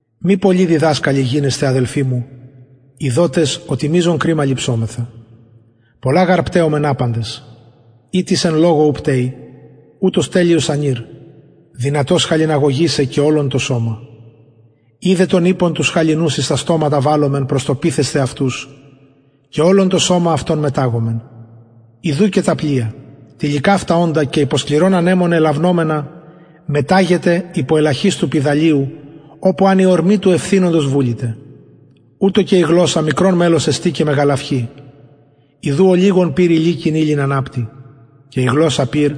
μη πολλοι διδασκαλοι γινεσθε αδελφοι μου ειδοτες οτι μειζον κριμα ληψομεθα πολλα γαρ πταιομεν απαντες ει τις εν λογω ου πταιει ουτος τελειος ανηρ δυνατος χαλιναγωγησαι και ολον το σωμα ιδε των ιππων τους χαλινους εις τα στοματα βαλλομεν προς το πειθεσθαι αυτους ημιν και ολον το σωμα αυτων μεταγομεν ιδου και τα πλοια τηλικαυτα οντα και υπο σκληρων ανεμων ελαυνομενα μεταγεται υπο ελαχιστου πηδαλιου οπου αν η ορμη του ευθυνοντος βουληται ουτως και η γλωσσα μικρον μελος εστιν και μεγαλαυχει ιδου ολιγον πυρ ηλικην υλην αναπτει και η γλωσσα πυρ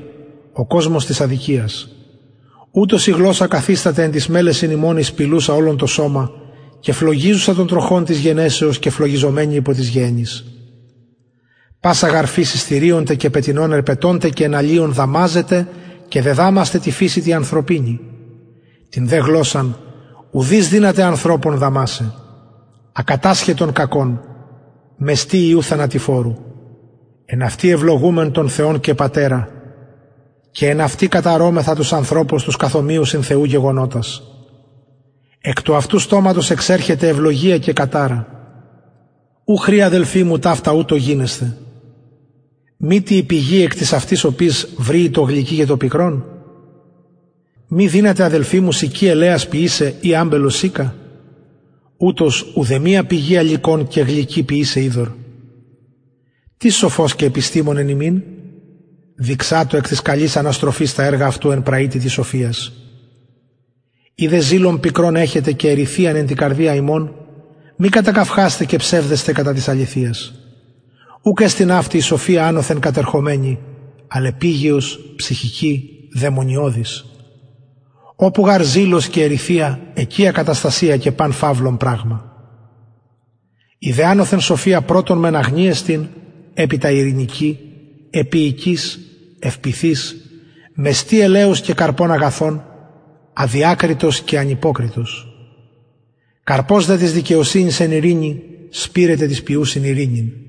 ο κοσμος της αδικιας ουτως η γλωσσα καθισταται εν τοις μελεσιν ημων η σπιλουσα ολον το σωμα και φλογιζουσα τον τροχον της γενεσεως και φλογιζομενη υπο της γεεννης πασα γαρ φυσις θηριων τε και πετεινων ερπετων τε και εναλιων δαμαζεται και δεδαμασται τη φυσει τη ανθρωπινη την δε γλωσσαν ουδεις δυναται ανθρωπων δαμασαι ακατασχετον κακον μεστη ιου θανατηφορου εν αυτη ευλογουμεν τον θεον και πατερα και εν αυτη καταρωμεθα τους ανθρωπους τους καθ ομοιωσιν θεου γεγονοτας εκ του αυτου στοματος εξερχεται ευλογια και καταρα ου χρη αδελφοι μου ταυτα ουτως γινεσθαι μητι η πηγη εκ της αυτης οπης βρυει το γλυκυ και το πικρον μη δυναται αδελφοι μου συκη ελαιας ποιησαι η αμπελος συκα ουτως ουδεμια πηγη αλυκον και γλυκυ ποιησαι υδωρ τις σοφος και επιστημων εν υμιν δειξατω εκ της καλης αναστροφης τα εργα αυτου εν πραυτητι σοφιας ει δε ζηλον πικρον εχετε και εριθειαν εν τη καρδια υμων μη κατακαυχασθε και ψευδεσθε κατα της αληθειας ουκ εστιν αυτη η σοφια ανωθεν κατερχομενη αλλ επιγειος ψυχικη δαιμονιωδης οπου γαρ ζηλος και εριθεια εκει ακαταστασια και παν φαυλον πραγμα η δε ανωθεν σοφια πρωτον μεν αγνη εστιν επειτα ειρηνικη επιεικης ευπειθης μεστη ελεους και καρπων αγαθων αδιακριτος και ανυποκριτος καρπος δε της δικαιοσυνης εν ειρηνη σπειρεται τοις ποιουσιν ειρηνην